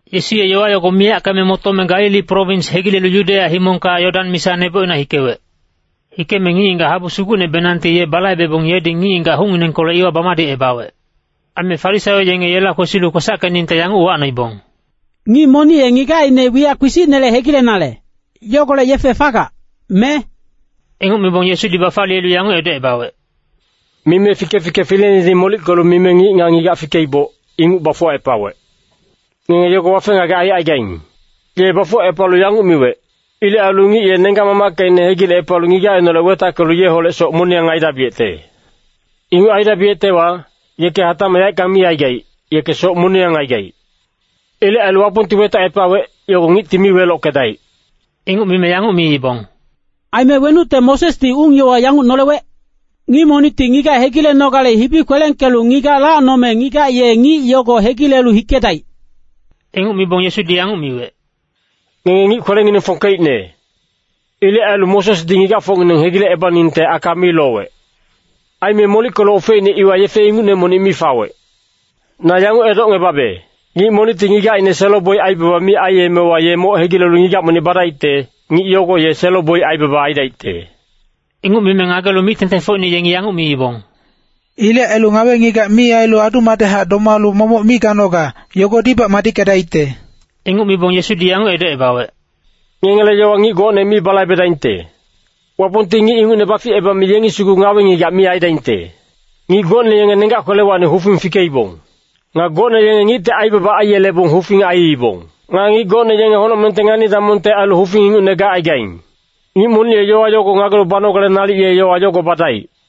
Yesu ye yowa yogo miyackeme motome Galili prowins hegilelu Yudeya himongka Yodan misa nebocina hikewec. Hikeme ngic-ngigac habu sugucnebenangti ye balaibebong yedi ngic-ngigac hucnginengkolec iwa bamadicebawec. Aime Farisaio yenge yela kwesilu kwesackeningte yanguc uwacnoibong, “Ngic monic ye ngigacine wiyac kpisicnele hegilenale, yogolec yefe fagac, me?” Inguc mibong Yesudi bafaliyelu yanguc edocebawec, “Mime Fike-fike fileinedi molickelu mime ‘Ngic nga ngigac fikeiboc, inguc bafuwacepawec.’ Ngenge yogo wafe-ngagec aicaigaing. Ye bafuwacepalu yanguc miwec, ‘Ilec ailu ngic ye nenggac-mamackecine hegilecepalu ngigacineholec wetackelu yeholec soc moniyang aidabiyecte.’ Inguc aidabiyectewa, yeke hatacmac yaeckang mi aigaic, yeke soc moniyang aigaic. Ilec ailu Wapongti wetacepawec, yogo ngicti mi welockedaic.” Inguc mime yanguc miibong, “Aime wenucte Mosesdi ung-yowa yanguc nolewec? Ngic monicti ngigac hegilenogale hibi kwelengkelu ngigac lacnome ngigac ye ngic yogo hegilelu hikedaic.” Inguc mibong Yesudi yanguc miwec, “Ngenge ngic kwelengineng fongkeicne. Ilec ailu Mosesdi ngigacfocngineng hegilecebaningte aka mi lowec. Aime molickelu ofeicne iwa yefe ingucne monic mi fawec. Na yanguc edocngebabe, ngic monicti ngigacine selo-boic aibaba mi aiyemewa ye moc hegilelu ngigac monic badaicte, ngic yogo ye selo-boic aibaba aidaicte.” Inguc mime ngagelu mic-tengtengfocine yengi yanguc miibong, “Ilec ailu ngawe-ngigac mi ailu adu-madechac domalu momoc mi ganoga, yogodibac madickedaicte.” Inguc mibong Yesudi yanguc edocebawec, “Ngengele yowa ngic gocne mi balaibedaingte. Wapongti ngic inguc baficebame yengi sugu ngawe-ngigac mi aidaingte. Ngic gocne yenge nenggac kwelewacni hufing fikeibong. Nga gocne yenge ngicti aibaba aiyelebong hufing aiibong. Nga ngic gocne yenge honocmengte ngani-damongte ailu hufing ingucne gacaigaing. Ngic monic ye yowa yogo ngagelu banogale nalic ye yowa yogo badaic.”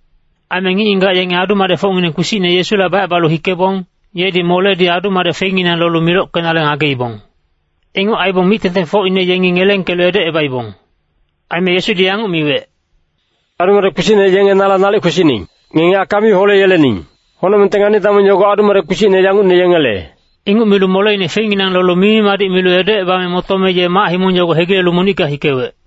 Aime ngic-ngigac yenge adu-madecfocngineng kpisicne Yesula bacebalu hikebong, yedi moledi adu-madec feinginang lolu milockenale ngageibong. Inguc aibong mic-tengtengfocine yengi ngelengkelu edocebaibong. Aime Yesudi yanguc miwec, “Adu-madec kpisicne yenge nala nalic kwesining. Ngenge aka mi holeyelening. Honocmengte ngani-damong yogo adu-madec kpisicne yangucne yengele.” Inguc milu moleine feinginang lolu mimi-madic milu edocebame motome ye mac-himong yogo hegilelu monicka hikewec.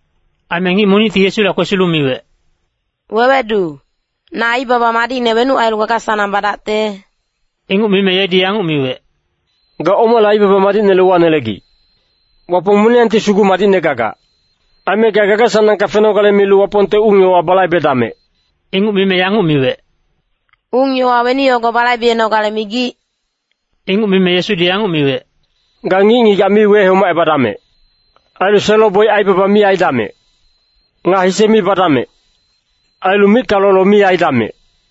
Aime ngic monicti Yesula kwesilu miwec, “Wewedu, na aibaba madicne wenuc ailu gaga-sanang badacte?” Inguc mime yedi yanguc miwec, “Ga omale aibaba madicnele uwanelegic? Wapong moniyangti sugu madicne gagac. Aime ga gaga-sanangka fenogale milu Wapongte ung-yowa balaibedamec.” Inguc mime yanguc miwec, “Ung-yowa weni yogo balaibenogale migic?” Inguc mime Yesudi yanguc miwec, “ ‘Ga ngic-ngigac mi wehomacebadamec. Ailu selo-boic aibaba mi aidamec. Nga hise mi badamec. Ailu micka lolo mi aidamec.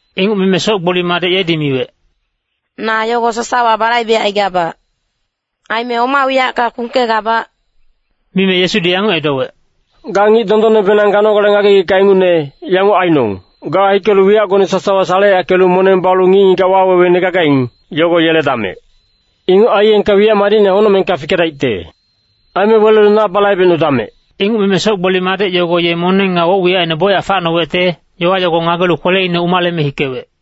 Inguc mime soc-gboli madec yedi miwec, “Na yogo sasawa balaibecaigabac. Aime oma wiyacka kpungkegabac?” Mime Yesudi yanguc edowec, “Ga ngic dondonnebenang ganogale ngagegicka ingucne, yanguc ainong, ga hikelu wiyacgone sasawa saleyackelu moneng balu ngic-ngigac waweweine gagaing, yogo yeledamec. Inguc aiyengka wiyac madicne honocmengka fikegeledaicte. Aime welelu na balaibecnudamec.” Inguc mime soc-gboli madec yogo ye moneng nga woc-wiyacine bocyac facnowecte, yowa yogo ngagelu kweleine umaleme hikewec.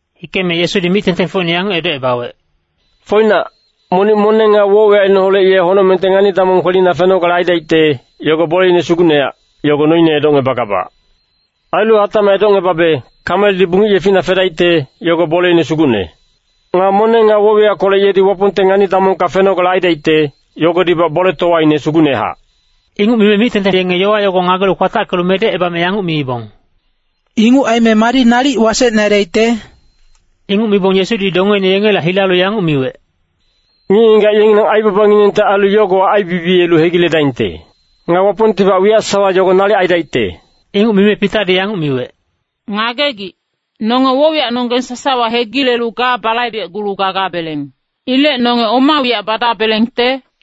Hikeme Yesudi mic-tengtengfocine yanguc edocebawec, “Foinac, monic moneng nga woc-wiyacineholec ye honocmengte ngani-damong kwelina fenogale aidaicte, yogo boleine sugucnehac, yogo noine edocngebagabac. Ailu hatacmac edocngebabe, kameldi bungic yefina fedaicte, yogo boleine sugucne. Nga moneng nga woc-wiyackolec yedi Wapongte ngani-damongka fenogale aidaicte, yogodibac boletowaine sugucnehac.” Inguc mime mic-tengteng yenge yowa yogo ngagelu kwatackelu medecebame yanguc miibong, “Inguc aime madi nalic wasecne aidaicte?” Inguc mibong Yesudi dongeine yengela hilalu yanguc miwec, “Ngic-ngigac yengileng aibabanginengte ailu yogowa aibibiyelu hegiledaingte. Nga Wapongtibac wiyac sasawa yogo nalic aidaicte.” Inguc mime Pitadi yanguc miwec, “Ngagegic, nonge woc-wiyacnonggeng sasawa hegilelu ga balaibecgulu gagabeleng. Ilec nonge oma wiyac badabelengte?”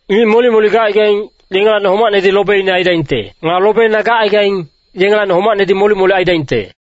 Ngic molic-molic gacaigaing, yengelacni homacnedi lobeine aidaingte. Nga lobeine gacaigaing, yengelacni homacnedi molic-molic aidaingte.”